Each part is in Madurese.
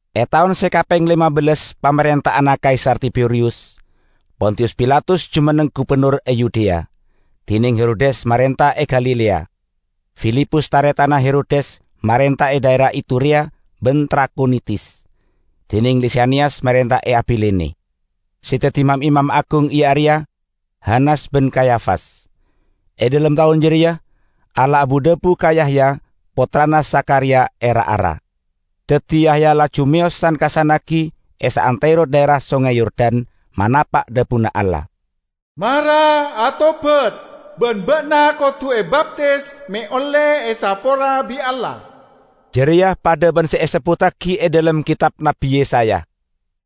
E taon se kapeng lema bellas pamarenta'anna Kaisar Tiberiyus, Pontiyus Pilatus jumenneng gubennor e Yudea, dineng Herodes marenta e Galilea. Filipus, taretanna Herodes marenta e dhaera Iturea ban Trakhonitis, dineng Lisaniyas marenta e Abilene. Se daddi mam-imam agung iya areya Hanas ban Kayafas. E dhalem taon jareya Allah abu-dhabu ka Yahya, pottrana Zakhariya e ra-ara. Daddi Yahya laju meyos san-kassannagi e saantero dhaera Songay Yordan, manapa' dhabuna Allah. "Mara atobat, ban ba'na kodu ebaptis me' olle esapora bi' Allah." Jareya padha ban se esebbuttagi e dhalem ketab Nabbi Yesaya,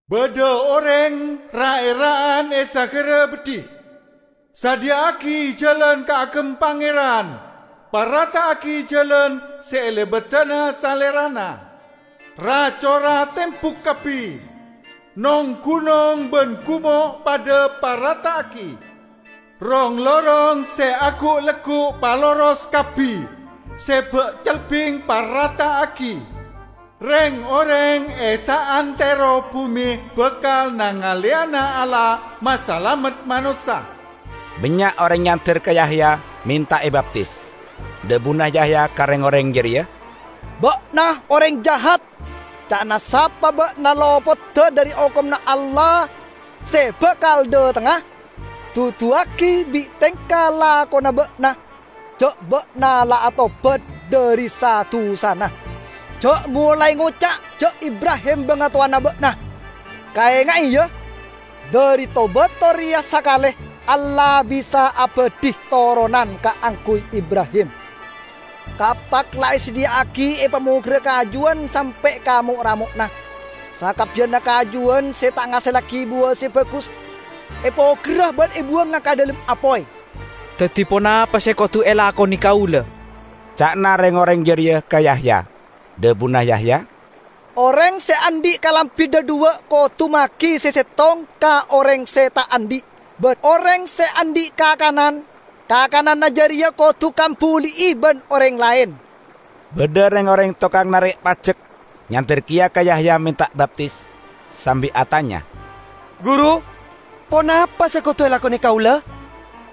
"Badha oreng ra'-era'an e sagara beddhi, 'Sadhiya'agi jalan kaagem Pangeran, parata'agi jalan se elebadana Salerana. Ra-cora tembuk kabbi, nong-gunong ban gumo' padha parata'agi. Rong-lorong se agu'-leggu' paloros kabbi, se ba'-celbing parata'agi. Reng-oreng e saantero bume bakal nangaleyana Allah masalamet manossa!' " Bannya' oreng nyander ka Yahya menta ebaptis. Dhabuna Yahya ka reng-oreng jareya, "Ba'na oreng jahat! Ca'na sapa ba'na lopoda dhari okomanna Allah se bakal dhatengnga? Duduwagi bi' tengka lakona ba'na ja' ba'na la atobat dhari sa-dusana! Ja' molae ngoca' ja' Ibrahim bangatowana ba'na. Kaenga'e, ya: Dhari to-bato reya sakale Allah bisa abadhi toronan kaangguy Ibrahim! Kapak la esadhiya'agi epamogerra kajuwan sampe' ka mo'-ramo'na. Sakabbiyanna kajuwan se ta' ngasellagi buwa se bagus epogerra ban ebuwanga ka dhalem apoy." "Daddi ponapa se kodu elakone kaula?" ca'na reng-oreng jareya ka Yahya. Dhabuna Yahya, "Oreng se andhi' kalambi dhadhuwa', kodu magi se settong ka oreng se ta' andhi'; ban oreng se andhi' kakanan, kakananna jareya kodu kambuli'i ban oreng laen." Badha reng-oreng tokang narek pajek nyander keya ka Yahya menta baptis, sambi atanya, "Guru, ponapa se kodu elakone kaula?"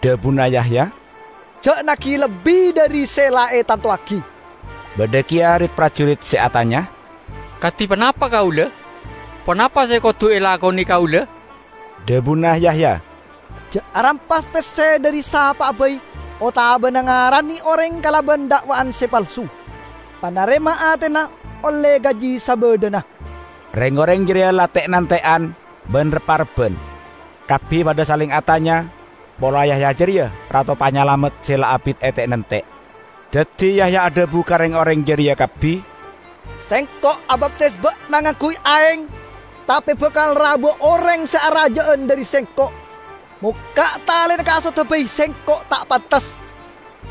Dhabuna Yahya, "Ja' nagi lebbi dhari se la etantowagi." Badha keya rit-parjurit se atanya, "Kadi ponapa kaula? Ponapa se kodu elakone kaula?" Dhabuna Yahya, "Ja' arampas pesse dhari sapa'a bai otabana ngarane oreng kalaban da'wa'an se palsu. Panarema atena olle gaji sabadhana!" Reng-oreng jareya la te'-nante'an ban rep-arebban, kabbi padha saleng atanya pola Yahya jareya Rato Panyalamet se la abit ete'-nante'. Daddi Yahya adhabu ka reng-oreng jareya kabbi, "Sengko' abaptis ba'na ngangguy aeng, tape bakal rabuwa oreng se araja'an dhari sengko'. Mokka' talena kasodda bai sengko' ta' pantes.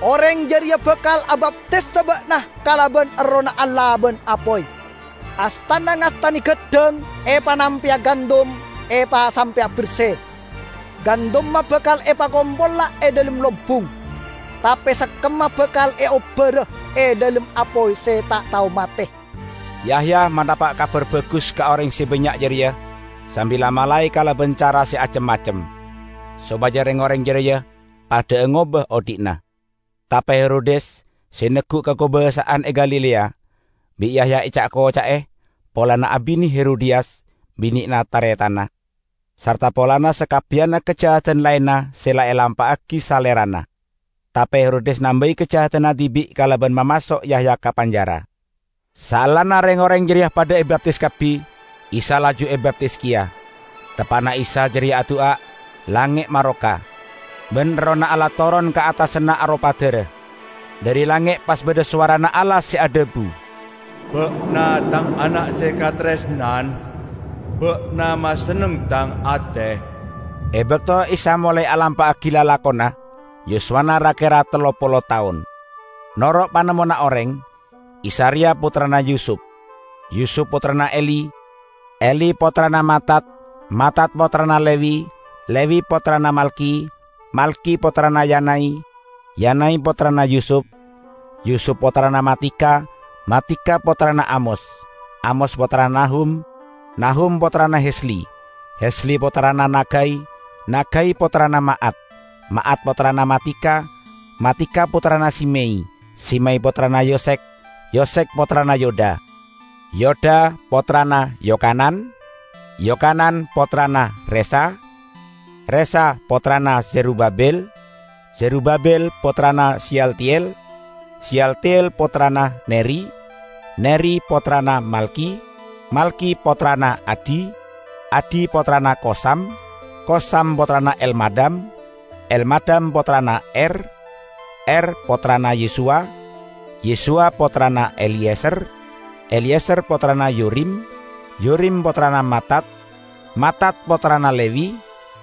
Oreng jareya bakal abaptisa ba'na kalaban Errohna Allah ban apoy. Astana ngastane gaddhang epanampeya gandum epasampe'a berse. Gandumma bakal epakompola e dhalem lombung, tape sekkemma bakal eobbara e dhalem apoy se ta' tao mate!" Yahya manapa' Kabar Bagus ka oreng se bannya' jareya sambi la-malae kalaban cara se acem-macem, sopaja reng-oreng jareya padha'a ngoba odhi'na. Tape Herodes, se neggu' kakobasa'an e Galilea, bi' Yahya eca'-koca'e polana abine Herodiyas, binena taretanna, sarta polana sakabbiyanna kajahadan laenna se la elampa'agi salerana. Tape Herodes nambai kajahadanna dibi' kalaban mamaso' Yahya ka penjara. Saellana reng-oreng jareya padha ebaptis kabbi, Isa laju ebaptis keya. Teppa'na Isa jareya adu'a, langnge' maroka, ban Errohna Allah toron ka attasanna aropa dara. Dhari langnge' pas badha sowarana Allah se adhabu, "Ba'na Tang ana' se kataresnan. Ba'na masenneng Tang ate." E bakto Isa molae alampa'agi lalakonna, yuswana ra-kera tello polo taon. Noro' panemmona oreng, Isa reya pottrana Yusup, Yusup pottrana Eli, Eli pottrana Matat, Matat pottrana Lewi, Lewi pottrana Malki, Malki pottrana Yanai, Yanai pottrana Yusup, Yusup pottrana Matica, Matica pottrana Amos, Amos pottrana Nahum, Nahum pottrana Hesli, Hesli pottrana Nagai, Nagai pottrana Ma'at, Ma'at pottrana Matica, Matica pottrana Simei, Simei pottrana Yosekh, Yosekh pottrana Yoda, Yoda pottrana Yokanan, Yokanan pottrana Resa, Resa pottrana Zerubabil, Zerubabil pottrana Seyaltiel, Seyaltiel pottrana Neri, Neri pottrana Malki, Malki pottrana Adi, Adi pottrana Kosam, Kosam pottrana Elmadam, Elmadam pottrana Er, Er pottrana Yesuwa, Yesuwa pottrana Eliyezer, Eliyezer pottrana Yorim, Yorim pottrana Matat, Matat pottrana Lewi,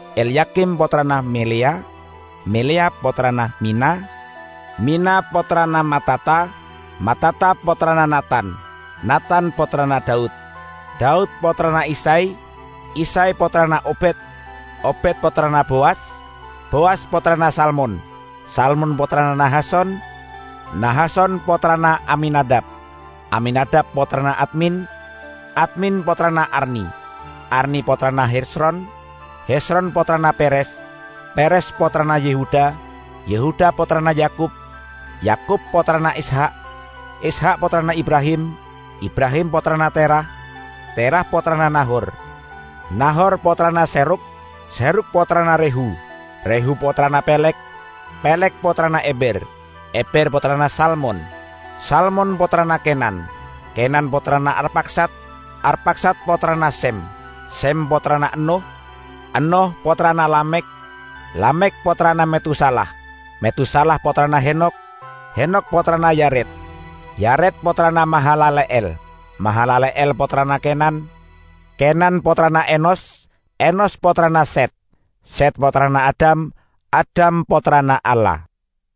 Elyakim pottrana Meleya, Meleya pottrana Mina, Mina pottrana Matata, Matata pottrana Natan, Natan pottrana Daud, Daud pottrana Isay, Isay pottrana Obed, Obed pottrana Bowas, Bowas pottrana Salmon, Salmon pottrana Nahason, Nahason pottrana Aminadab, Aminadab pottrana Admin, Admin pottrana Arni, Arni pottrana Hezron, Hezron pottrana Peres, Peres pottrana Yehuda, Yehuda pottrana Yakub, Yakub pottrana Ishak, Ishak pottrana Ibrahim, Ibrahim pottrana Terah, Terah pottrana Nahor, Nahor pottrana Serug, Serug pottrana Rehu, Rehu pottrana Peleg, Peleg pottrana Eber, Eber pottrana Salmon, Salmon pottrana Kenan, Kenan pottrana Arpakhsad, Arpakhsad pottrana Sem, Sem pottrana Ennoh, Ennoh pottrana Lamekh, Lamekh pottrana Metusalah, Metusalah pottrana Henokh, Henokh pottrana Yared, Yared pottrana Mahalale'el, Mahalale'el pottrana Kenan, Kenan pottrana Enos, Enos pottrana Set, Set pottrana Adam, Adam pottrana Allah.